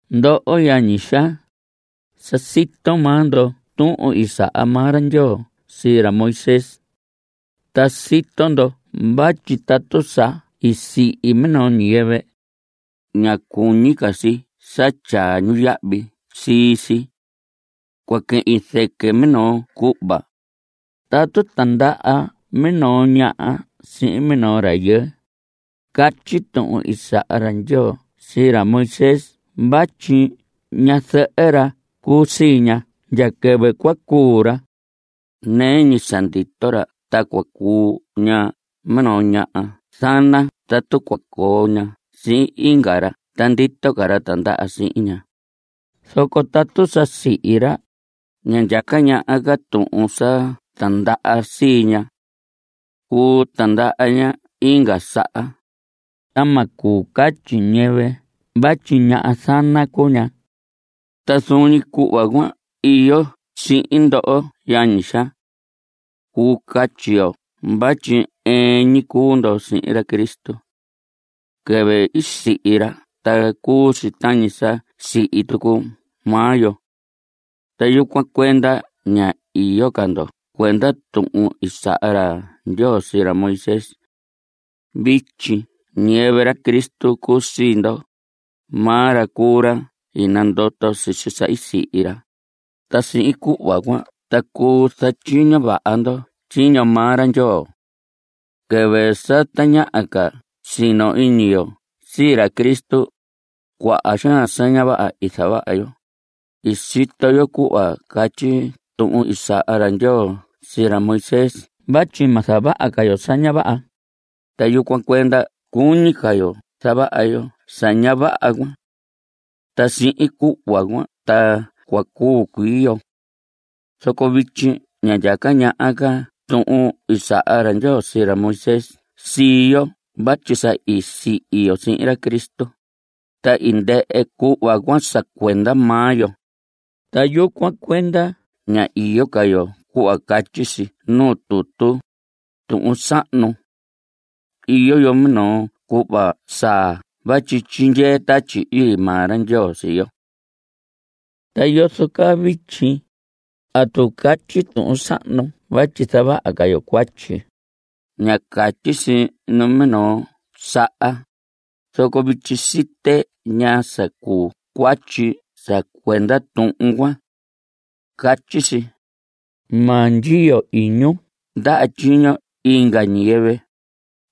Ndoho yañi xaa, sa sito maa ndo tuhun i saha maa ra Ndyoo sii ra Moisés. Ta sito ndo vatyi tatu sa i sihi minoo ñiyɨvɨ, ña cuñi ca si sa tyaa ñu yahvi sii si. Cua quehin zɨquɨ minoo cuhva. Tatu tindaha minoo ñaha sihin minoo rayɨɨ, catyi tuhun i saha ra Ndyoo sii ra Moisés vatyi ñazɨhɨ ra cuu sii ña ndya quɨvɨ cua cuu ra. Nɨɨ ñi sa ndito ra ta cua cuu ña minoo ñaha zana tatu cua coo ña sihin inga ra ta ndito ca ra tindaha sihin ña. Zoco tatu sa sihi ra, ña ndyaca ñaha ca tuhun sa tindaha sii ña. Cuu tindaha ña inga saha, ta ma cuu catyi ñiyɨvɨ vatyi ñaha zana cuu ña. Ta zuun ñi cuhva cuan iyo sihin ndoho yañi xaa. Cuu catyi yo vatyi ɨɨn ñi cuu ndo sihin ra Cristo. Quɨvɨ i sihi ra ta cuu si tañi sa sihi tucu maa yo. Ta yucuan cuenda ña iyo ca ndo cuenda tuhun i saha ra Ndyoo sii ra Moisés. Vityi ñiyɨvɨ ra Cristo cuu sii ndo. Maa ra cuu ra i nandoto sisi sa i sihi ra, ta sihin cuhva cuan ta cuu zatyiño vaha ndo tyiño maa ra Ndyoo. Quɨvɨ sa tañaha ca sino iñi yo sii ra Cristo, cuaha xaan sa ña vaha i zavaha yo. I sito yo cuhva catyi tuhun i saha ra Ndyoo sii ra Moisés vatyi ma zavaha ca yo sa ña vaha, ta yucuan cuenda cuñi ca yo zavaha yo sa ña vaha cuan. Ta sihin cuhva cuan ta cua cuu cuii yo. Zoco vityi ña ndyaca ñaha ca tuhun i saha ra Ndyoo sii ra Moisés sii yo vatyi sa i sihi yo sihin ra Cristo, ta i ndɨhɨ cuhva cuan sa cuenda maa yo. Ta yucuan cuenda ña iyo ca yo cuhva catyi si nuu tutu, tuhun sahnu. Iyo yo minoo cuhva saa vatyi tyindyee Tatyi Ii maa ra Ndyoo sii yo. ¿Ta yozo caa vityi? ¿Atu catyi tuhun sahnu vatyi zavaha ca yo cuatyi? ¡Ña catyi si numinoo saha! Zoco vityi site ñaa sa cuu cuatyi sa cuenda tuhun cuan. Catyi si: “Ma ndyiyo iñun ndaha tyiño inga ñiyɨvɨ.”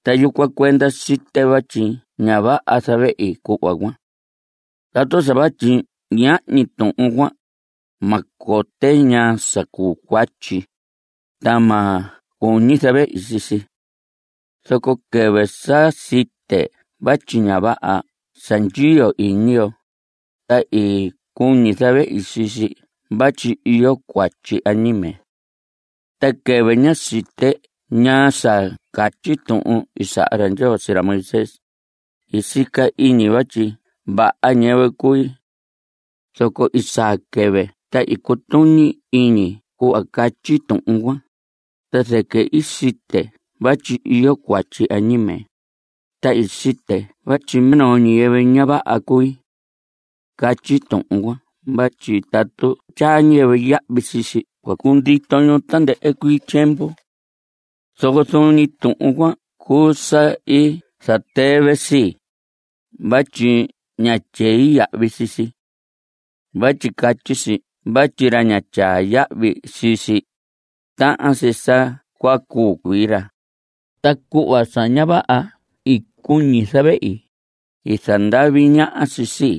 Ta yucuan cuenda site vatyi ña vaha zavehi cuhva cuan. Tatu sa vatyi ñahñi tuhun cuan, ma cote ñaa sa cuu cuatyi, ta ma cuñi zavehi sii si. Zoco quɨvɨ sa site vatyi ña vaha sa ndyiyo iñi yo, ta i cuñi zavehi sii si vatyi iyo cuatyi añime. Ta quɨvɨ ñá site ñaa sa catyi tuhun i saha ra Ndyoo sii ra Moisés, i sica iñi vatyi vaha ñiyɨvɨ cui. Zoco i saa quɨvɨ ta i cutuñi iñi cuhva catyi tuhun cuan, ta zɨquɨ i site vatyi iyo cuatyi añime, ta i site vatyi minoo ñiyɨvɨ ña vaha cui. Catyi tuhun cuan vatyi tatu tyaa ñiyɨvɨ yahvi sii si cua cundito ñu tandɨhɨ cuii tyiemvu. Zoco zuun ñi tuhun cuan cuu sa i zatɨvɨ sii, vatyi ñá tyei yahvi sii si. Vatyi catyi si vatyi ra ña tyaa yahvi sii si, tahan si sa cua cuu cuii ra. Ta cuhva sa ña vaha i cuñi zavehi, i zandavi ñaha si sii.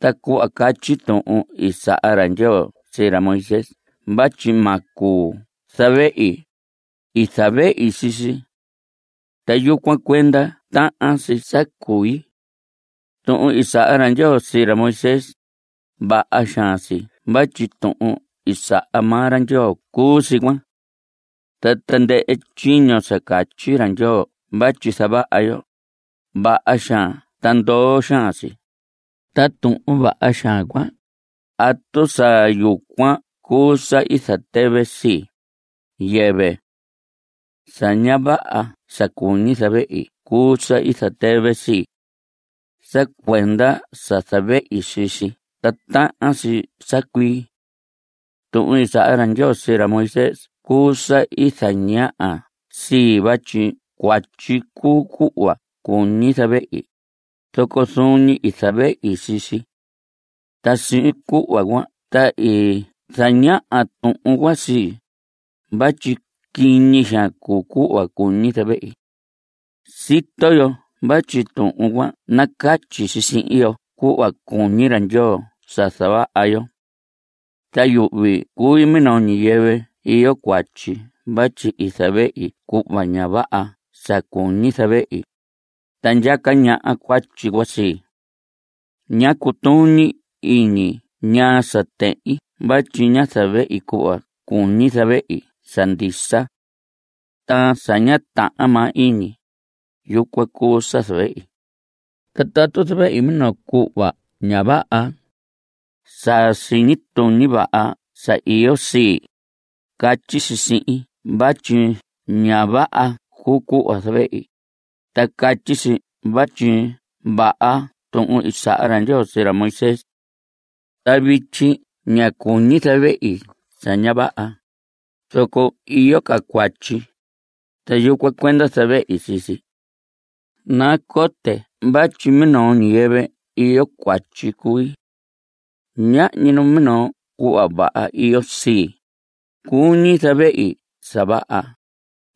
Ta cuhva catyi tuhun i saha ra Ndyoo sii ra Moisés vatyi ma cuu zavehi, i zavehi sii si. Ta yucuan cuenda tahan si sa cui. Tuhun i saha ra Ndyoo sii ra Moisés, vaha xaan si vatyi tuhun i saha maa ra Ndyoo cuu si cuan. Ta tandɨhɨ tyiño sa catyi ra Ndyoo vatyi zavaha yo, vaha xaan ta ndoo xaan si. Ta tuhun vaha xaan cuan ¿atu sa yucuan cuu sa i zatɨvɨ sii? Yɨvɨ. Sa ña vaha sa i cuñi zavehi cuu sa i zatɨvɨ sii. Sa cuenda sa zavehi sii si ta tahan si sa cui. Tuhun i saha ra Ndyoo sii ra Moisés cuu sa i zañaha sii, vatyi cuatyi cuu cuhva cuñi zavehi, zoco zuun ñi i zavehi sii si. Ta sihin cuhva cuan ta i zañaha tuhun cuan sii, vatyi quiñi xaan cuu cuhva cuñi zavehi. Sito yo vatyi tuhun cuan nacatyi si sihin yo cuhva cuñi ra Ndyoo sa zavaha yo. Ta yuhvi cui minoo ñiyɨvɨ iyo cuatyi vatyi zavehi cuhva ña vaha sa cuñi zavehi, ta ndyaca ñaha cuatyi cuan sii. Ña cutuñi iñi ñaa sa tehin vatyi ña zavehi cuhva cuñi zavehi sa ndisa. Ta sa ña tahan maa iñi, yucuan cuu sa zavehi. Ta tatu zavehi minoo cuhva ña vaha, sa siñi tuñi vaha sa iyo sii, catyi si sihin vatyi ña vaha cuu cuhva zavehi, ta catyi si vatyi vaha tuhun i saha ra Ndyoo sii ra Moisés. Ta vityi ña cuñi zavehi sa ña vaha, zoco iyo ca cuatyi. Ta yucuan cuenda zavehi sii si. Nacote vatyi minoo ñiyɨvɨ iyo cuatyi cui. Ñahñi numinoo cuhva vaha iyo sii. Cuñi zavehi sa vaha,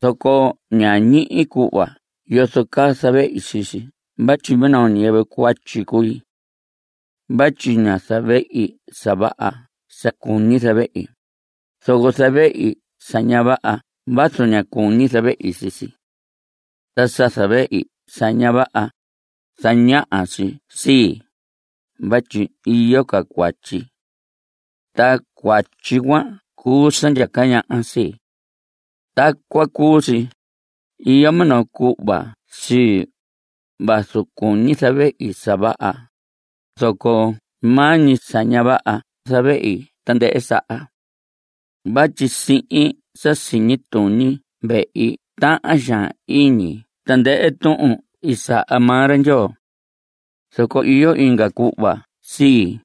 zoco ña ñihi cuhva yozo caa zavehi sii si vatyi minoo ñiyɨvɨ cuatyi cui. Vatyi ña zavehi sa vaha sa cuñi zavehi, zoco zavehi sa ña vaha vazu ña cuñi zavehi sii si. Ta sa zavehi sa ña vaha, zañaha si sii, vatyi iyo ca cuatyi. Ta cuatyi cuan cuu sa ndyaca ñaha sii. Tacuan cuu si. Iyo minoo cuhva sii. Vazu cuñi zavehi sa vaha, zoco maa ñi sa ña vaha zavehi tandɨhɨ saha. Vatyi sihin sa siñi tuñi vehi tahan xaan iñi tandɨhɨ tuhun i saha maa ra Ndyoo. Zoco iyo inga cuhva sii,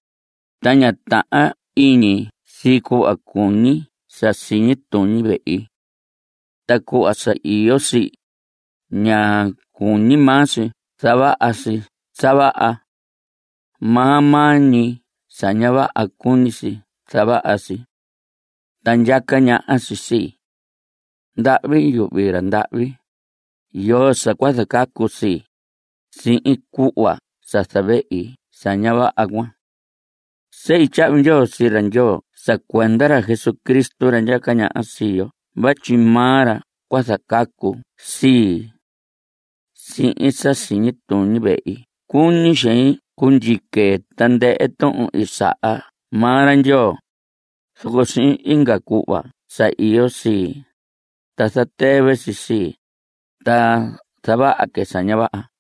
ta ña tahan iñi si cuhva cuñi sa siñi tuñi vehi. Ta cuhva sa iyo sii, ña cuñi maa si zavaha si sa vaha. Maa maa ñi sa ña vaha cuñi si zavaha si. Ta ndyaca ñaha si sii. ¡Ndahvi yuhvi ra ndahvi! ¿Yoo sa cua zacacu sii, sihin cuhva sa zavehi sa ña vaha cuan? Sehi tyahvi ndyoo sii ra Ndyoo sa cuenda ra Jesucristo ra ndyaca ñaha sii yo vatyi maa ra cua zacacu sii. Sihin sa siñi tuñi vehi cuñi xein cundyique tandɨhɨ tuhun i saha maa ra Ndyoo, zoco sihin inga cuhva sa iyo sii, ta zatɨvɨ si sii, ta zavaha que sa ña vaha.